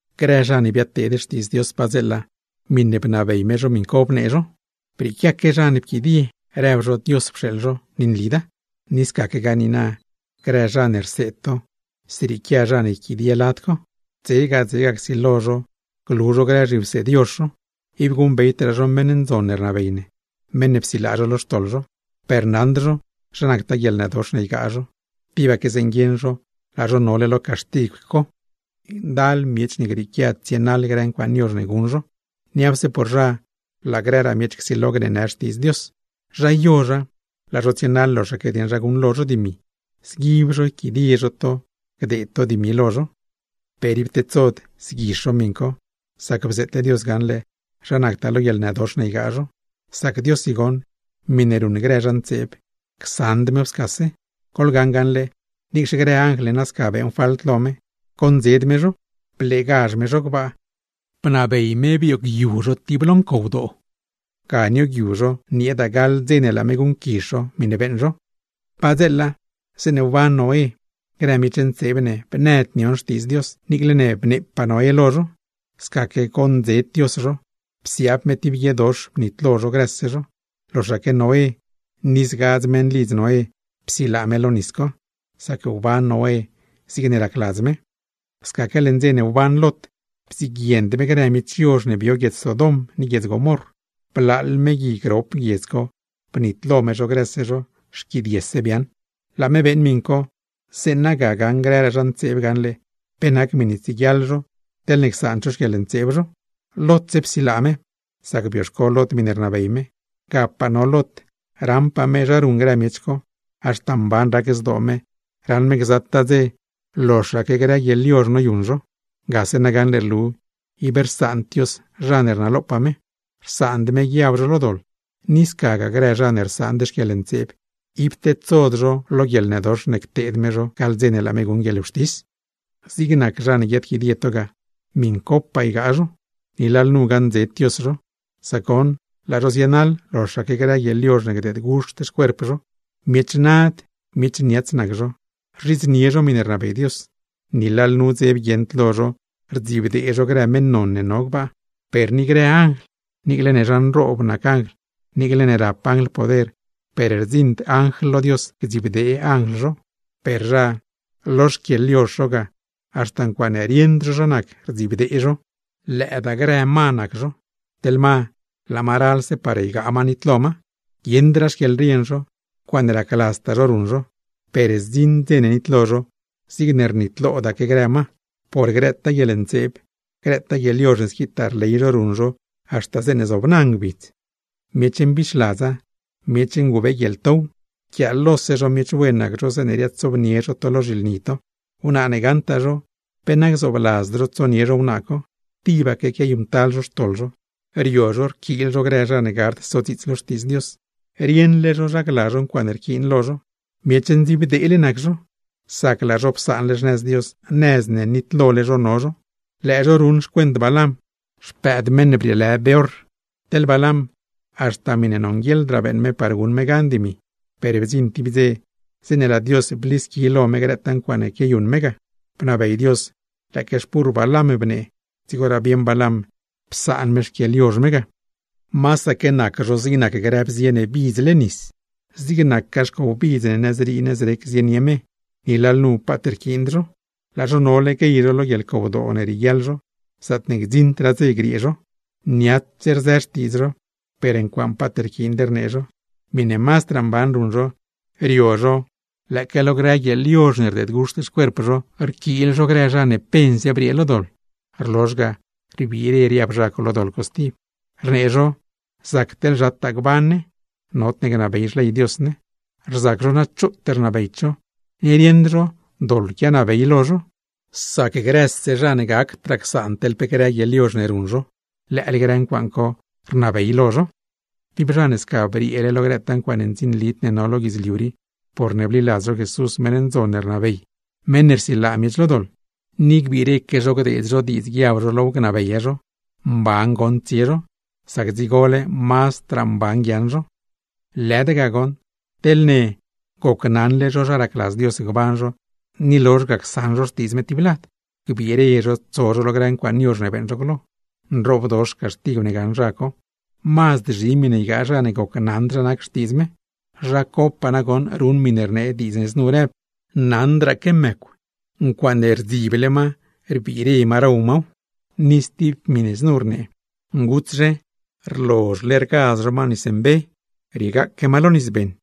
Grë zha ne biadteed Xtiidz Dios padzeela, miṉe bnabey me zho miṉ co bnee zho; per brieequiaque zha ne pquidie rëb zho Dios pxeeḻ zho, ni nlida. Ni scaquegaa niina, grë zha ne rseed to, zrieequia zha ne yquidie lad co. Dzega dzega csilo zho glu zho grë zhiwseed yozh zho, ib guṉbeydraa zho meṉ ndzon ne rnabey ne, meṉ ne psilaa zho lo xtoḻ zho; per naṉd zho zha nactaa guieḻnëdox ne ygaa zho, tibaque zeeṉe guieṉ zho laa zho nole lo caxtigw co. Ndal miech ne grieequia tsienaḻ grë ncuaaṉ yozh ne guṉ zho, niapse por zha laa grëraa miech csilo gneenë Xtiidz Dios. Zha yozha, laa zho tsienaḻ loxaque dieṉ zha guṉlo zho dimi, zguib zho yquidie zho to gdeed to dimi lo zho. Per ib tedsod zguizh zho miṉ co, sac bzeetle Dios gaṉle zha nactaa lo guieḻnëdox ne ygaa zho; sac Diossi goṉ, miṉe ruṉ grë zha ntseeb, csaṉd mew scase. Goḻgaṉ gaṉle, niicxe grë anjl ne sca beeṉ falt lo me, goṉdzed me zho, bleegazh me zho gbaa, bnabey me bioogyu zho tib lo ncowdoo, ga nioogyu zho nieeda gaḻ dze ne laa me guṉquizh zho miṉe beeṉ zho. Padzeela zeeṉe wban Noé, grë miech ntseeb ne bnëd nion xtiidz me niicle ne bneepaa Noé lo zho, scaque goṉdzed me zho, psiaab me tib guiedox bnitlo zho grëse zho; loxaque Noé ni zgadz meṉlidz Noé psilaa me lo nis co; sac wban Noé zigne racladz me. Scaque leṉ dze ne wban Lot, bdziguiend me grë miech yozh ne bio guiedz Sodom ni guiedz Gomorr, blaaḻ me gui grop guiedz co, bnitlo me zho grëse zho, xquidiese biaaṉ. Laa me beeṉ miṉ co, zeeṉa ga gaṉ grëraa zha ntseeb gaṉle pe nac miṉe tsieguiaḻ zho teḻne csaand zho xquieḻntseeb zho. Lotse psilaa me, sac bioxco Lot miṉe rnabey me. Gapaa no Lot, raṉpaa me zha ruṉ grë miech co; haxta mban rac zdoo me, raṉ me gzataa dze loxaque grë guieḻyozh noyuṉ zho. Gase na gaṉle rlu ib rsaand Dios zha ne rnalopaa me, rsaand me guiab zho lo doḻ; ni scagaa grë zha ne rsaand guieḻntseeb, ib tedsod zho lo guieḻnëdox ne cteed me zho gaḻ dze ne laa me guṉ guieḻwxtis. ¡Zig nac zha ne guiaadquidie to ga, miṉcopaa ygaa zho! Ni lalnu gaṉdzed Dios zho; sac goṉ, laa zho zienaḻ loxaque grë guieḻyozh ne gdeed guxt xcuerp zho. Miech nad, miech niats nac zho, rzhidznie zho miṉe rnabey Dios, ni lalnu dzeb guieṉd lo zho rdzibdee zho grë meṉ non ne no gbaa. Per ni grë anjl, niicle ne zha nroob nac anjl, niicle ne rap anjl poder, per rdziṉd anjl lo Dios gdzibdee anjl zho. Per zha, lo xquieḻyozh zho ga, haxta ncuaaṉe rieṉd zho zha nac, rdzibdee zho. Lëëdaa grë ma nac zho, teḻ ma laa ma ralse par ygaa ma nitlo ma; guieṉdraa xquieḻrien zho, ncuaaṉe racladztaa zho ruṉ zho. Per zdziṉ dze ne nitlo zho, zigne rnitlodaque grë ma, por grëtaa guieḻntseeb, grëtaa guieḻyozh ne squitaa rley zho ruṉ zho haxta zobna ngbidz. Miech mbixladza, miech ngubeeguieḻtow, rquiaalose zho miech wen nac zho zeeṉe riaadsobnie zho to lo zhilni to. Wnaa ne gaṉtaa zho, pe na gzoobladzd zho tsonie zho wnaa co, tibaque quiayuṉctal zho xtoḻ zho. Rio zho rquiil zho grë zha ne gard sodziits lo Xtiidz Dios; rieṉle zho zha gla zho ncuaaṉe rquiin lo zho. Miech ndziibdeele nac zho, sac laa zho psaanle xnëz Dios, nëz ne nitlole zho no zho; lëë zho ruṉ xcuent Balam, xpëëd meṉ ne lë Beor. Teḻ Balam, haxta miṉe nonguieḻdraa beeṉ me par guṉ me gan dimi; per bdziṉ tib dze zeeṉe laa Dios blisqui lo me grëtaa ncuaaṉe quiayuṉ me ga. (Bnabey Dios lëëque xpurr Balam bnee, dzigoraa bieṉ Balam psaan me xquieḻyozh me ga.) Masaque nac zho zig nac grë bzie ne bidzle nis, zig nacgaa xcow bidz ne nëzrii nëzrec zienie me; ni lalnu paat rquiind zho. ¡Laa zho nole guey zho lo guieḻcowdoo ne rieguiaḻ zho, zaatne gdziṉdraa dze griee zho! Niats rzë xtiidz zho, per ncuaaṉe paat rquiind rnee zho. Miṉe mazdraa mban ruṉ zho, rio zho lëëque lo grë guieḻyozh ne rdeed guxt xcuerp zho rquiil zho grë zha ne pense briee lo doḻ, rlozh ga rbiire riab zha co lo grë doḻ co stib. Rnee zho zac teḻ zhataa gban ne, nodne gnabey xley Dios ne. Rzac zho na choot rnabeyd zho, ni rieṉd zho doḻ quianabey lo zho; sac grëse zha ne gacdraa csaan teḻ pe grë guieḻyozh ne ruṉ zho, lëële grë ncuaaṉ co rnabey lo zho. Tib zha ne sca brieele lo grëtaa ncuaaṉe ndzinlid ne no lo guidzliu rii (porne bliladz zho Jesús, meṉ ndzon ne rnabey, meṉ ne rsilaa miech lo doḻ), ni gbiireque zho gdeed zho diidz guiab zho low gnabeya zho, mban goṉ tsie zho; sac dzigole mazdraa mban guiaaṉ zho. Lëda ga goṉ, teḻne gocnaṉle zho zha racladz Dios gban zho, ni lozh ga csaṉ zho xtiidz me tib lad, gbiire zho tso zho lo grë ncuaaṉ yozh ne beeṉ zho glo. Nroobdox caxtigw ne gaṉ zha co, mazd zhi miṉe ygaa zha ne gocnaṉd zha nac xtiidz me. Zha copaa nagoṉ ruṉ miṉe rnee diidz ne znu rëb: “Naṉdraaque mëcw, ncuaaṉe bdzible ma rbiire ma row maw”; ni stib miṉe znu rnee: “Ngutszhe, rlozhle raz ma nis mbe, ni rlozh ga riegaaque ma lo nis beṉ.”